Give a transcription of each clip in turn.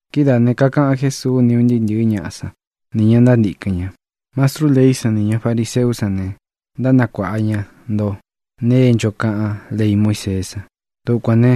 Kidáā ne, kakaꞌan Jésuu ni un ntɨɨ́ ntɨ̄ɨ́ ñaꞌa sán, nī ña ntántīkɨn ña: —Mastrú leí san nī ña fariseú san ne, ntánakuāꞌa ña ntó nēe é ncho kaꞌán lei Muíseé san. Dukuān ne,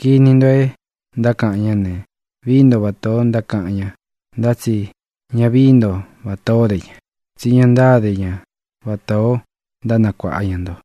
kini nto é ntákaꞌan ñá ne, vií nto vatā ó ntákaꞌan ña, ntá tsi ña vií nto vatā ó de ña, tsí ña ntáde ña vatā ó ntánakuāꞌa ña nto.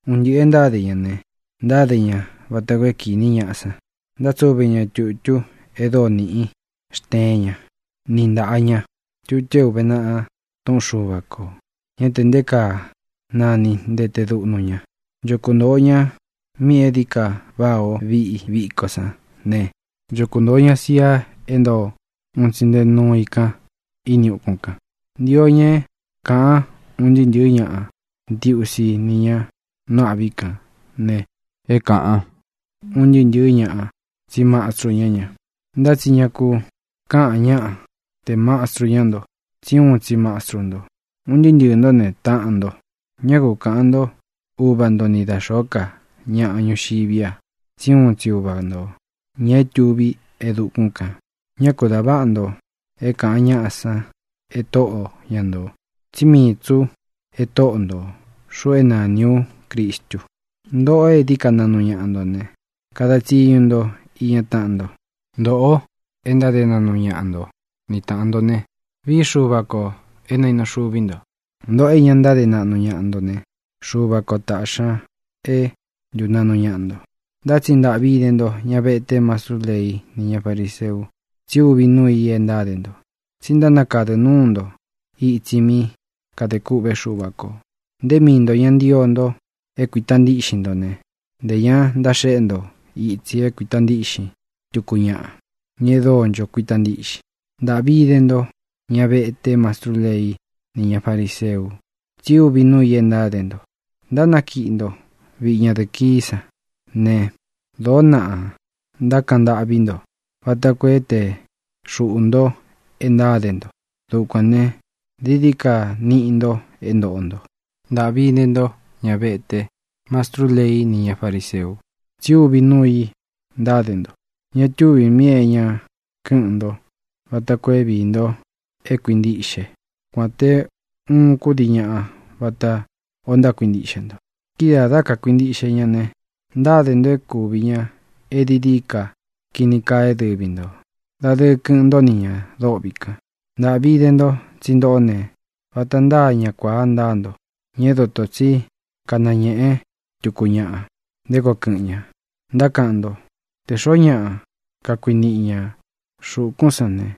Un ntɨꞌɨ̄ e ntáde ña ne, ntáde ña vata koo é kīni ñaꞌa san. Ntátsuve ña tūtú e dóo nīꞌí xteén ña ni ntāꞌa ña, tutu é ūve naꞌa túꞌun Xuva kō. Ñá tē nté kaa nani ntete duꞌnu ña. Ncho kuntōo ña míꞌī e dií ka váꞌā ó viꞌi viko sán ne, ncho kuntōo ña sia é ntoo un tsi nte núu i kan ini ukún kān. Ntio ña é kāꞌan ún ntɨɨ́ ntɨ̄ɨ́ ñaꞌa ntiusi ni ña nú āꞌví kān ne, é kāꞌan ún ntɨɨ́ ntɨ̄ɨ́ ñaꞌa tsí mastru ñá ña. ʼNtá tsi ña ku kaꞌán ñaꞌa tē mastru ñá nto, tsí uun tsi Mastru nto. Un ntɨɨ́ ntɨɨ̄ ntó ne, taꞌan nto. Ñá ku kaꞌān ntó Uva nto ni da xōó ka ñaꞌa ñuxiví a, tsí uun tsi Uva ntō, ña é tuví e dukún kān. Ñá ku dā váꞌa nto é kāꞌan ñáꞌa san e tóꞌo ña ntō, tsí mii tsī ú e Tóꞌo ntō, xuꞌu é nāni ú Cristu. Ntōꞌo é dií ka naꞌnu ñaꞌa nto ne, kada tsiñu nto iña táꞌan nto. Ntoꞌo e ntáde naꞌnu ñaꞌa nto ni tāꞌan nto ne, vií Xuva kō é nainu xuvi ntō. Ntōꞌo é ña ntáde naꞌnu ñaꞌa nto ne, Xuva kō taꞌxi ña é ntunaꞌnu ñaꞌa nto. ʼNtá tsi ¡ntāꞌvi ide ntó, ña vete, mastrú leí nī ña fariseu!, tsi úvi nuu i é ntáde nto. Tsí ntánakadɨ núu nto itsi mí kadē kûꞌvé Xuva kō. Nté mii ntō ña ntío nto é kuīta ntíꞌxin nto ne, ntē ña ntaxéꞌe nto itsi é kuīta ntíꞌxin tuku ñaꞌa, ña e dóo ncho kuíta ntiꞌxin. ʼ¡Ntāꞌvi ide ntó, ña vete, mastrú leí nī ña fariseu!, tsi úvi nuu i é ntáde nto. Ntánakiꞌi nto viꞌi ñadɨ̄ꞌɨ kií san ne, dōó naꞌa ntákaꞌan ntâꞌví nto vata koo é tēe xuꞌu nto e ntáde nto. Dukuān ne, dií dií ka niꞌi nto é ntōꞌo nto. ʼ¡Ntāꞌvi ide ntó, ña vete, mastrú leí nī ña fariseu!, tsi úvi nuu i ntáde nto. Ña túvī míꞌī é ña kɨ́ꞌɨn nto vata koo é viī nto é kuintiꞌxe kuān té uun kúdii ñaꞌa vatā o ntákuintiꞌxe nto. Kidáā, dá kakuīntiꞌxe ña ne, ntáde nto é kūvi ña é dií dií ka kini kaa é dɨvi ntō. Dadɨɨ kɨꞌɨn ntó ni ñā dôꞌvi kan. ʼ¡Ntāꞌvi ide nto! tsí ntōꞌó ne, vata ntáa ña kuāa ntáa nto, ña é dotō tsí kanañēꞌe túku ñaꞌa nté koo kɨ̄ꞌɨn ña. Ntákaꞌan nto: “Tē xoó ñaꞌa kakuniꞌi ñā xúkūn sán ne,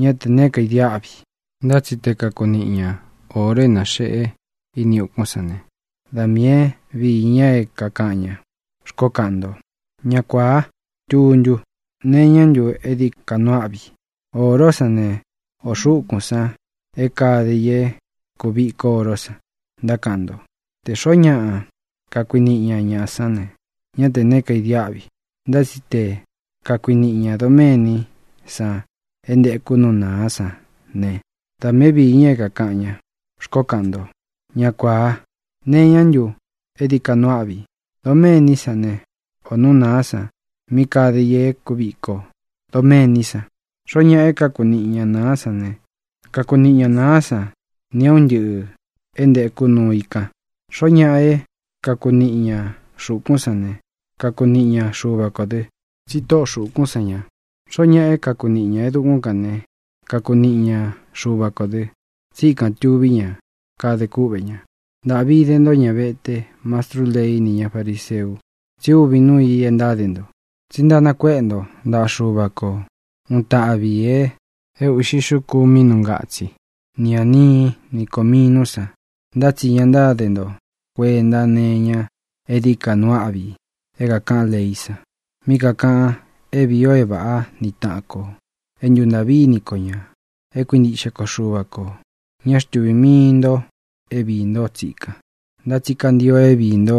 ñá tē neé kaidiáꞌvi. Ntá tsi te kakuniꞌi ña ōro é naxeꞌe ini ukún san ne, da miī é viī ña é kākaꞌan ña”, xkoó kaꞌan nto. ¡Ña kuāá tuntu! ¿Nee iñá ntu é dií ka nuu áꞌvi: ōró san ne, o xūkún san é kāde i e kúviko oro san? Ntákaꞌan nto: “Tē xoó ñaꞌa kakuniꞌi ña nāá san ne, ñá tē neé kaidiáꞌvi. Ntá tsi te kakuniꞌi ñā doméní san é ntēku nú nāá san ne, da miī é viī ña é kākaꞌan ña”, xkoó kaꞌan nto. ¡Ña kuāa! ¿Nee iñá ntu é dií ka nuu áꞌvi: doméní san ne, ō nú nāá san mí kade i e kúviko doméní san? Xoó ñaꞌa é kakuniꞌi ña nāá san ne, kakuniꞌi ña nāá san nī é un ntɨꞌɨ̄ é ntekú nuu i kan. Xoó ñaꞌa é kakuniꞌi ña xūkún san ne, kakuniꞌi ña Xuva kō dɨ, tsí tóꞌo xūkún san ña. Xoó ñaꞌa é kakuniꞌi ñā é dukún kān ne, kakuniꞌi ña Xuva kō dɨ, tsí ikān tuví ña, kadē kúꞌvē ña. ʼ¡Ntāꞌvi ide ntó, ña vete, mastrú lei ni ña fariseu!, tsi úvi nuu i é ntáde nto. Tsi ntánakuéꞌe nto ntaꞌa Xuva ko uun taꞌvi ī é uꞌxi xuku mínū ngatsí, ni ānií, ni kōminú san, ntá tsi ña ntáde nto kuenta née iña é dií ka nuu áꞌvi é kākaꞌan leí san, mí kākaꞌan é vīi o é vāꞌá ni taꞌan kō, é ntuntāꞌví ini ko ñā, é kuintiꞌxe ko Xuva kō. Ña xtúvī mii nto é viī ntó tsikan, ntá tsi kantio é viī nto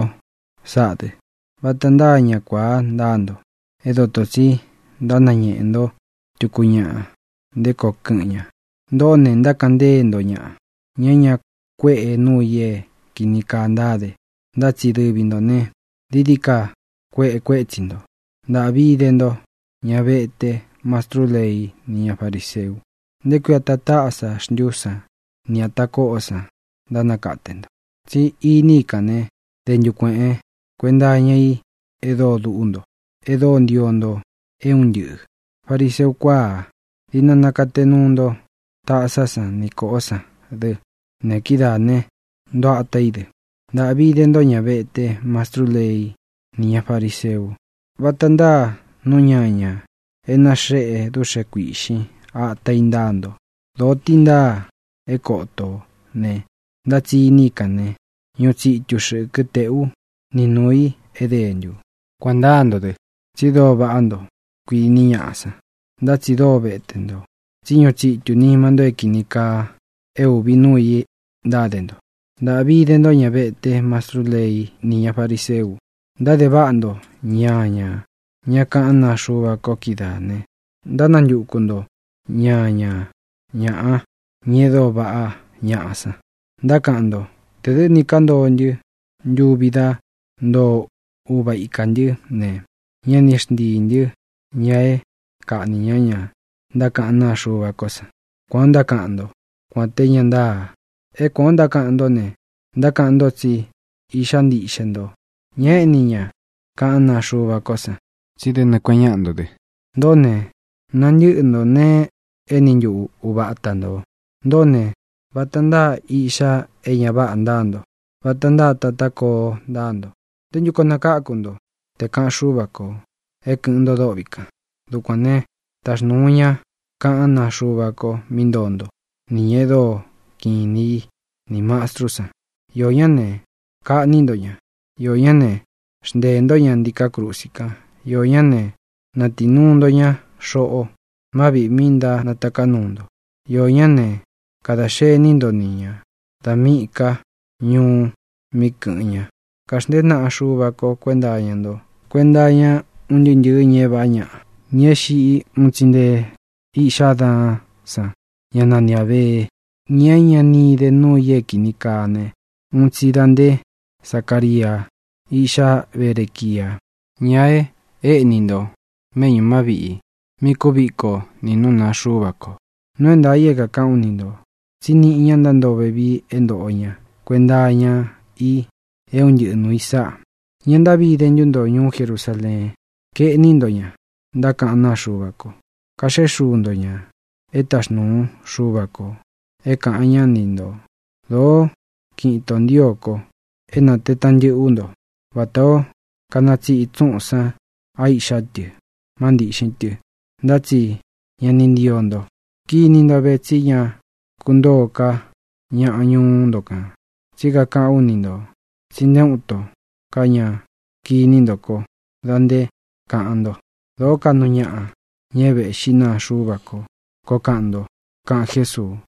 sáꞌā dɨ. ¡Vata ntáa ña kuāa ntáa nto é dotō tsi ntánañeꞌe nto tuku ñaꞌa nté koo kɨ̄ꞌɨn ña! ¡Ntōꞌó ne, ntákaꞌan ntée nto ñaꞌa, ña é ña kuéꞌe nuu i é kīni kaa ntáde, ntá tsi dɨvi ntō ne, dií dií ka kueꞌe kuétsi ntō! ʼ¡Ntāꞌvi ide ntó, ña vete, mastrú lei ni ña fariseu! ¿Nté kui ata tásá xntu san ni ata kóꞌó san ntánakate nto? Tsi iní i kān ne, dentu kueꞌen kuenta iña í e dóo dúꞌu nto, e dóo ntio nto é un ntɨꞌɨ̄. ¡Fariseu kuaa! Diꞌna nakate nuu nto tásá san ni kōꞌó san dɨ ne, kidáā ne, ntoo atá i dɨ. ʼ¡Ntāꞌvi ide ntó, ña vete, mastrú lei ni ña fariseu! Vata ntáa nú ñañā é naxeꞌe dúꞌxe kuīꞌxin ata i ntáa nto. Dōo tí ntaa é koto ō ne, ntá tsi iní i kān ne, ñuꞌu tsitu xɨkɨ tēꞌú ni nūu i é dentū. Kuān ntáa nto dɨ, tsi dóo vaꞌá nto, kuiní ñaꞌá san, ntá tsi dóo vete nto, tsí ñuꞌu tsitū nima nto é kīni kaa, e úvi nuu i ntáde nto. ʼ¡Ntāꞌvi ide ntó, ña vete, mastrú lei ni ña fariseu! Ntáde váꞌa nto ñañā ñá kaꞌán naa Xuva ko kídaā ne, ntántakutu nto ñaña ñāꞌa, ña e dóo vaꞌá ñaꞌa san. Ntákaꞌan nto: “Tē dɨ́ ni kántoo ntɨ́ ntuvi dá ntoo uva ikā ntɨ́ ne, ña ni xntíī ntɨ́ ña é kaꞌnī ñá ña ntákaꞌán naa Xuva ko san.” Kuān ó ntákaꞌan ntó, kuān té ña ntáa. É kuān ó ntákaꞌan ntó ne, ntákaꞌan nto tsí iꞌxá ntiꞌxe nto ña éꞌni ña kaꞌán naa Xuva ko san, tsí dé nɨɨ̄ kueꞌen ñáꞌa nto dɨ. Ntōꞌó ne, nantɨ̄ꞌɨ ntó nēe e éni ntuꞌu uva ata ntō. ʼ¡Ntōꞌó ne, vata ntáa iꞌxá e ña váꞌā ntáa nto, vata ntáa tatá koo ntáa nto! ¿Nté ntu koo nakáku nto te kāꞌan Xúva kō é kɨ̄ꞌɨn nto dôꞌvi kan? Dukuān né, taxnūu ú ña kaꞌán naa ko mí ntoo nto, nī ña e dóo kiꞌin inī í, nī mastrú san. Iō ñá ne, kaꞌní nto ña. Iō ñá ne, xnteē ntó ña ntiká krusi kan. Iō ñá ne, natii nuu nto ña xoꞌo má viꞌī mi ntánataká nuu nto. Iō ñá ne, kadā xení nto ni ñā da míꞌī ká ñuú mí kɨ̄ꞌɨn ña. Kaxntēé naꞌa Xúva ko kuēnta ntó kuenta iña un ntɨɨ́ ntɨ̄ɨ́ ña é vāꞌá ñaꞌa, ña é xiꞌi, uun tsi nté iꞌxá Adaán san, ñá nani Ābee, ña é ña ni ide núu ī é kīni kaa ne, uun tsi da nté Zacaria, íꞌxá Berequia, ña e éꞌní nto méꞌñū má viꞌī mí kuviko nī nú nāa Xuva ko. Nuu é ntaā i é kākaꞌán u ni ntō tsí niꞌi ña ntántoo vevii é ntōꞌo ña kuenta iña i é un ntɨꞌɨ nūu i sáꞌa. ʼ¡Ña ntáꞌvi ide ntu nto, ñuú Jerusaleen! Kaeꞌní nto ña ntákaꞌán naa Xuva ko. Kaxéꞌe xuu nto ña é taxnuu Xuva kō é kāꞌan ñá ni ntō. Dōó kiꞌin itō ntío ko é nātee taꞌan ntɨꞌɨ ú nto vatā ó kanatsiꞌi tsúꞌūn san á iꞌxá tɨ má ntīꞌxin tɨ, ntá tsi ña ni ntío nto. Kiní nto ve, tsí ña kuntóo ká ñaꞌa ñuú nto kān. Tsí kakaꞌán u ni ntō tsi nté uun itó ka ña kiní nto kó dā nté kāꞌan nto: “Dōó kaꞌnu ñaꞌa, ña é vēꞌxí naa Xuva ko”, koo kaꞌan nto —kaꞌan Jésuu.